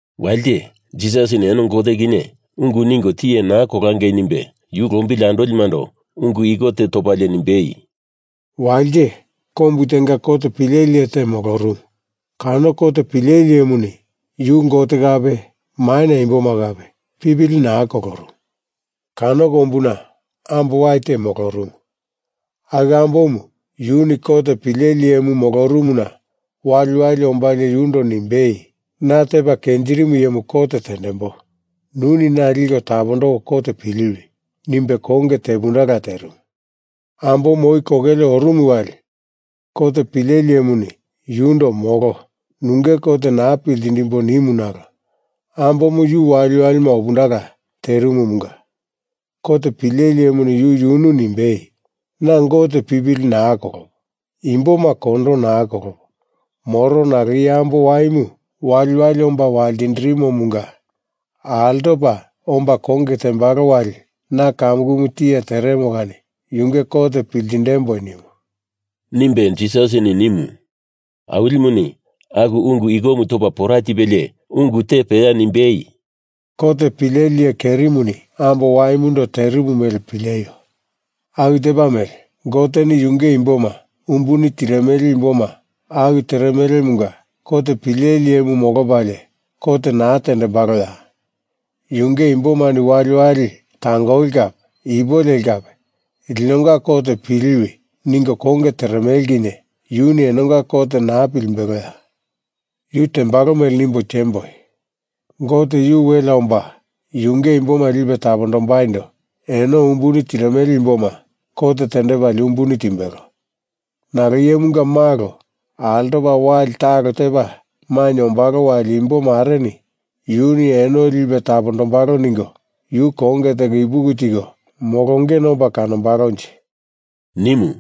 Walite, Jisasini Eno Gote kinye ungu ningo tiye naa kolangei nimbe yu lombili andolimando ungu iko te topalie nimbei, “Walite, kombu tenga kot pileli iye te molorumu. Kano kot pileli iyemuni yu Gote kape maina imboma kape pipili naa kolorumu. Kano kombuna ambo wai te molorumu. Aku ambomu yuni kot pileli iyemu molorumuna waliwali ombalie yundo nimbei, ‘Na tepa kenjirimu iyemu kot tendembo. Nuni na liko tapondoko kot piliwi,’ nimbe konge tepundala terimu. Ambomu oi kokele orumu wali kot pileli iyemuni yundo molo, nunge kot naa piltindimbo nimu nalo, ambomu yu waliwali opundala terimumunga kot pileli iyemu yu yunu nimbei, ‘Na Gote pipili naa kolopo, imboma kondo naa kolopo moro nalo i ambo waimu waliwali omba waltindirimomunga altopa omba konge tembalo wali na kamukumu tiye teremo kani yunge kot piltindemboi,’ nimu,” nimbe Jisasini nimu. Awilimuni aku ungu ikomu topa pora tipelie ungu te peya nimbei, “Kot pileli iye kerimuni ambo waimundo terimu mele pileio! Aku tepa mele Goteni yunge imboma umbuni tirimele imboma aku teremelemunga kot pileli iyemu molopalie kot naa tendembaloya? Yunge imbomani waliwali tangoli kape ipo leli kape linonga kot piliwi ningo konge teremele kinye yuni enonga kot naa pilimbeloya? Yu tembalo mele nimbo tiemboi. Gote yu welea omba yunge imboma lipe tapombaindo, eno umbuni tirimele imboma kot tendepalie umbuni timbelo. Nalo Iyemunga Malo altopa wali talo tepa mainye ombalo wali imbo mareni yuni eno lipe tapondombalo ningo yu konge teko ipuki tiko molongena omba kanombalonje,” nimu.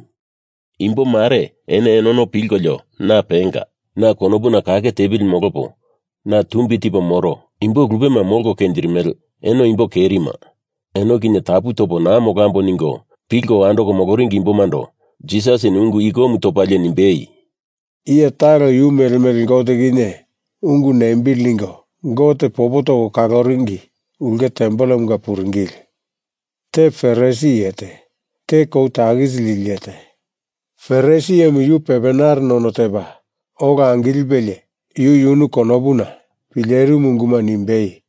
Imbo mare eno enono pilkolio na penga, na konopuna kake tepili molopo, na tumbi tipo moro, imbo lupema molko kenjirimele, eno imbo kerima, eno kinye tapu topo naa molambo ningo pilko andoko moloringi imbomando Jisasini i ungu ikomu topalie nimbei, “Iye talo yu mele mele Gote kinye ungu nembili ningo Gote popo toko kaloringi ulke tempelemunga puringili. Te Farisi iye te, te kou takis lili iye te. Farisi iyemu yu pepenare none tepa ola angilipelie yu yunu konopuna pilerimu unguma nimbei,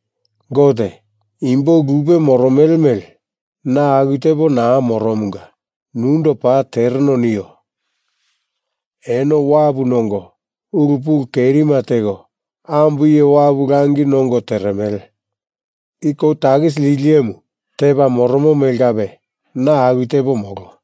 ‘Gote, imbo lupe moromele mele na aku tepo naa moromunga nundo paa tereno nio. Eno wapu nongo, ulu pulu kerima teko, ambo iye wapu langi nongo teremele. I kou takis lili iyemu tepa moromo mele kape na aku tepo molo.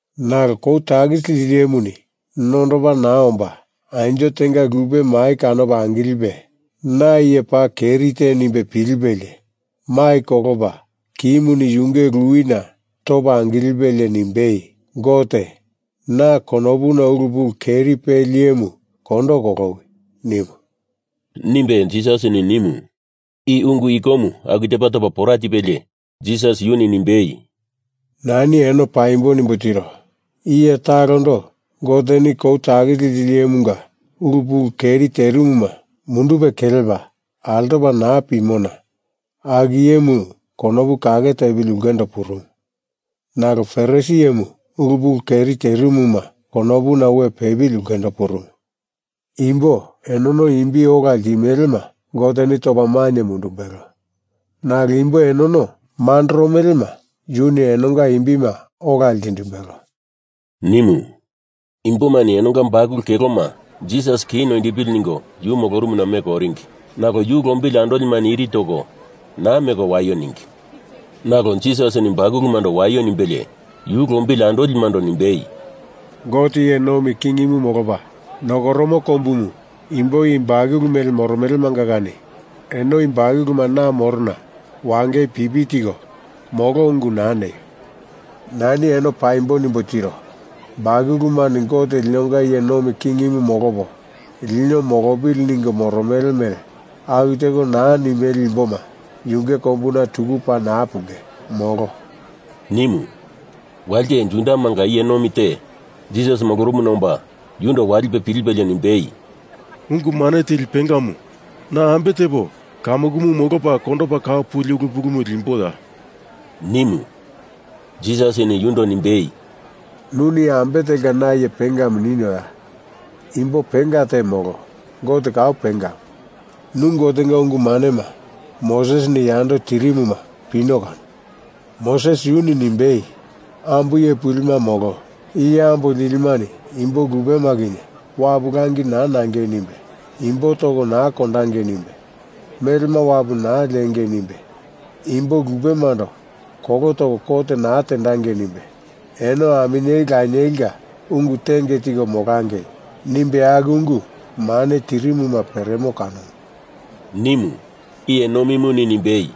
Nalo kou takis lili iyemu nondopa naa omba anjo tenga lupe mai kanopa angilipe, na iye paa keri te nimbe pilipelie mai kolopa kimuni yunge luwina topa angilipelie nimbei, ‘Gote, na konopuna ulu pulu keri peli iyemu kondo kolowi,’ nimu,” nimbe Jisasini nimu. I ungu ikomu aku tepa topa pora tipelie Jisas yuni nimbei, “Nani eno paimbo nimbo tiro. I iye talondo Goteni kou takis lili iyemunga ulu pulu keri terimuma mundupe kelepa altopa naa pimona, aku iyemu konopu kake tepili ulkendo purumu, nalo Farisi iyemu ulu pulu keri terimuma konopuna we pepili ulkendo purumu. Imbo enono imbi ola ltimelema Goteni topa mainye mundumbelo, nalo imbo enono mandoromelema yuni enonga imbima ola lindimbelo,” nimu. Imbomani enonga bakulu keloma Jisas ki noindipili ningo yu molorumuna meko oringi. Nalo yu lombili andolimani iri toko naa meko waio ningi. Nalo Jisasini bakulumando waio nimbelie yu lombili andolimando nimbei, “Gote iye nomi kingimu molopa nokoromo kombumu imbo i bakulu mele moromelemanga kani eno i bakuluma na morona wangei pipi tiko molo ungu naa neio. Nani eno paimbo nimbo tiro. Bakulumani Gote linonga iye nomi kingimu molopo lino nokopili ningo moromele mele aku teko naa nimele imboma yunge kombuna tuku paa naa punge, molo,” nimu. Walite Juda imbomanga iye nomi te Jisas molorumuna omba yundo walipe pilipelie nimbei, “Ungu Mane Tili Pengamu, na ambe tepo kamukumu molopa kondopa kau puli ulu pulumu limboya?” nimu. Jisasini yundo nimbei, “Nuni ambe telka na iye pengamu ninoya? Imbo penga te molo. Gote kau pengamu. Nu Gotenga ungu manema Mosesini yando tirimuma pino kano. Moses yuni nimbei, ‘Ambo iye pulima molo iye ambo lilimani imbo lupema kinye wapu langi naa nangei nimbe, imbo toko naa kondangei nimbe, melema wapu naa liengei nimbe, imbo lupemando kolo toko kot naa tendangei nimbe, eno aminyeli lanielinga ungu tenge tiko molangei,’ nimbe aku ungu mane tirimuma peremo kanomu,” nimu. Iye nomimuni nimbei,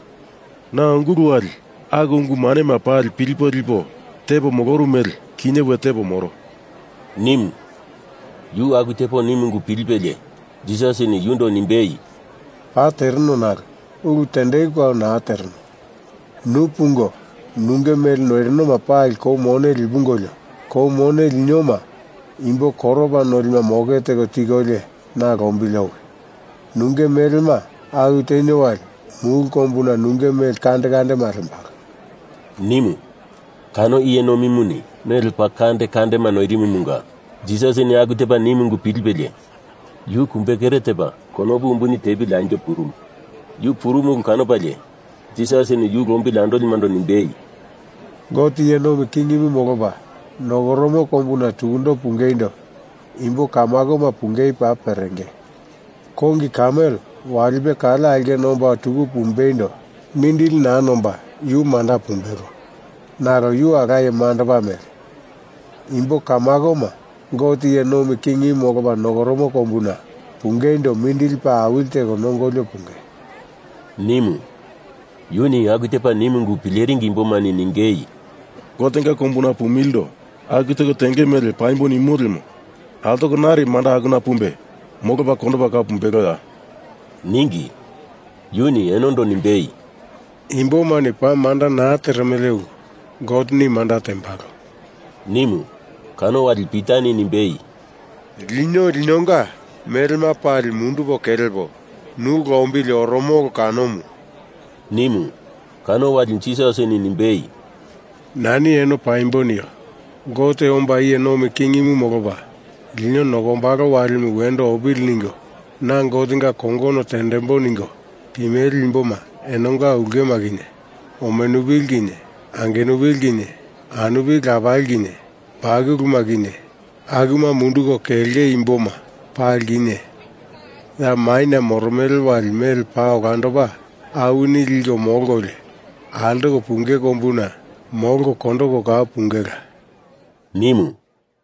“Na ungulu wali aku ungu manema pali pilipo lipo tepo moloru mele kinye we tepo moro,” nimu. Yu aku tepo nimu ungu pilipelie Jisasini yundo nimbei, “Paa tereno nalo ulu tendeku kau naa tereno. Nu pungo nunge mele noirinoma pali kou mone lipungolio, kou mone linioma imbo koropa nolima moke teko tikolio na lombili owi. Nunge melema aku tenio wali mulu kombuna nunge mele kande kandema lembalo,” nimu. Kano iye nomimu mele paa kande kandema noirimumunga Jisasini aku tepa nimu ungu pilipelie yu kumbekere tepa konopu umbuni tepili anjo purumu. Yu purumu ulu kanopalie Jisasini yu lombili andolimando nimbei, “Gote iye nomi kingimu molopa nokoromo kombuna tukundo pungeindo imbo kamakoma pungei paa perenge. Kongi kamel walipe kale aulkena omba tuku pumbeindo mindili awili tepa nomba pumbei perembalo. Nalo yu alaye mandopa mele. Imbo kamakoma Gote iye nomi king molopa nokoromo kombuna pungeindo mindili paa awili teko nongolio punge,” nimu. Yuni aku tepa nimu ungu pileringi imbomani ningei, “Gotenga kombuna pumilindo aku teko tenge mele paimbo nimo lemo altoko nari manda akuna pumbe molopa kondopa kau pumbeloya?” ningi. Yuni enondo nimbei, “Imbomani paa manda naa teremele ulu Goteni manda tembalo,” nimu. Kano wali Pitani nimbei, “Lino linonga melema pali mundupo kelepo nu lombili oromolo kanomu,” nimu. Kano wali Jisasini nimbei, “Nani eno paimbo nio. Gote omba iye nomi kingimu molopa lino nokombalo walimu wendo opili ningo na Gotenga kongono tendembo ningo pimele imboma enonga ulkema kinye, omenupili kinye, angenupili kinye, anupili lapali kinye, bakuluma kinye, akuma munduko kelenge imboma pali kinye ya maina moromele wali mele paa olandopa awini liko molkolio altoko punge kombuna molko kondoko kau pungela,” nimu.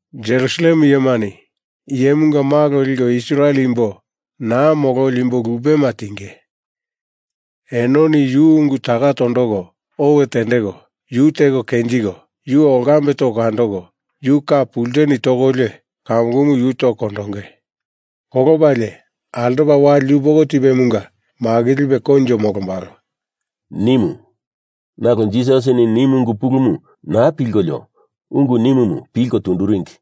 Jerusalem iyemani Iyemunga Malo liko Israel imbo naa mololi imbo lupema tinge. Enoni yu ungu taka tondoko owe tendeko yu teko kenjiko yu olkambe toko kandoko, yu ka pulteni tokolio, kamukumu yu toko kondonge. Kolopalie altopa wali yupoko tipemunga makilipe koinjo molombalo,” nimu. Nalo Jisasini nimu ungu pulumu naa pilkolio ungu nimumu pilko tunduringi.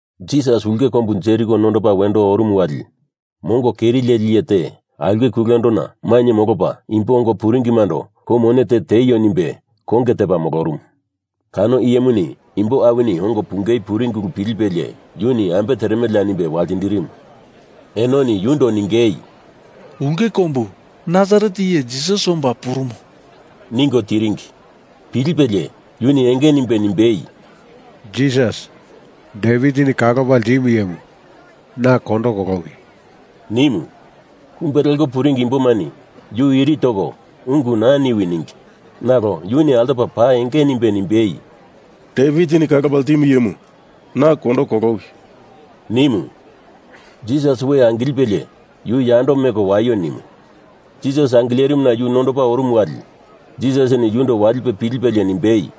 Jisas ulke kombu Jeriko nondopa wendo orumu wali mongo keri leli iye te aulke kulendona mainye molopa imbo ongo puringimando kou mone te tieio nimbe konge tepa molorumu. Kano iyemuni imbo awini ongo pungei puringi ulu pilipelie yuni ambe teremeleya nimbe waltindirimu. Enoni yundo ningei, “Ulke kombu Nasaret iye Jisas omba purumo,” ningo tiringi. Pilipelie, yuni enge nimbe nimbei, “Jisas, Devitini kalopa ltimu iyemu, na kondo kolowi,” nimu. Kumbe leko puringi imbomani yu iri toko ungu naa niwi ningi. Nalo yuni altopa paa enge nimbe nimbei, “Devitini kalopa ltimu iyemu, na kondo kolowi,” nimu. Jisas we angilipelie yu yando meko waio nimu. Jisas angilerimuna yu nondopa orumu wali Jisasini yundo walipe pilipelie nimbei,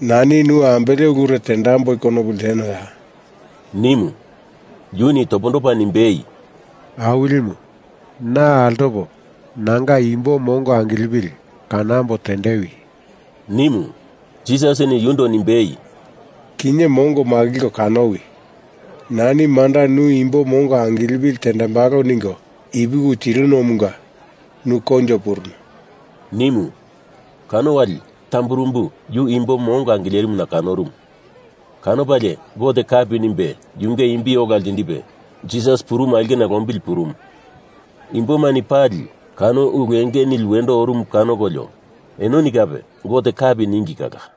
“Nani nu ambele ulure tendamboi konopu ltenoya?” nimu. Yuni topondopa nimbei, “Awilimu, na altopo nanga imbo mongo angilipili kanambo tendewi,” nimu. Jisasini yundo nimbei, “Kinye mongo makilko kanowi. Nani manda nu imbo mongo angilipili tendembalo ningo ipuki tirinomunga nu koinjo puruno,” nimu. Kano wali tamburumbu yu imbo mongo angilerimuna kanorumu. Kanopalie Gote kapi nimbe yunge imbi ola ltindilipe Jisas purumu aulkena lombili purumu. Imbomani pali kano ulu enge nili wendo orumumu kanokolio enoni kape Gote kapi ningi kala.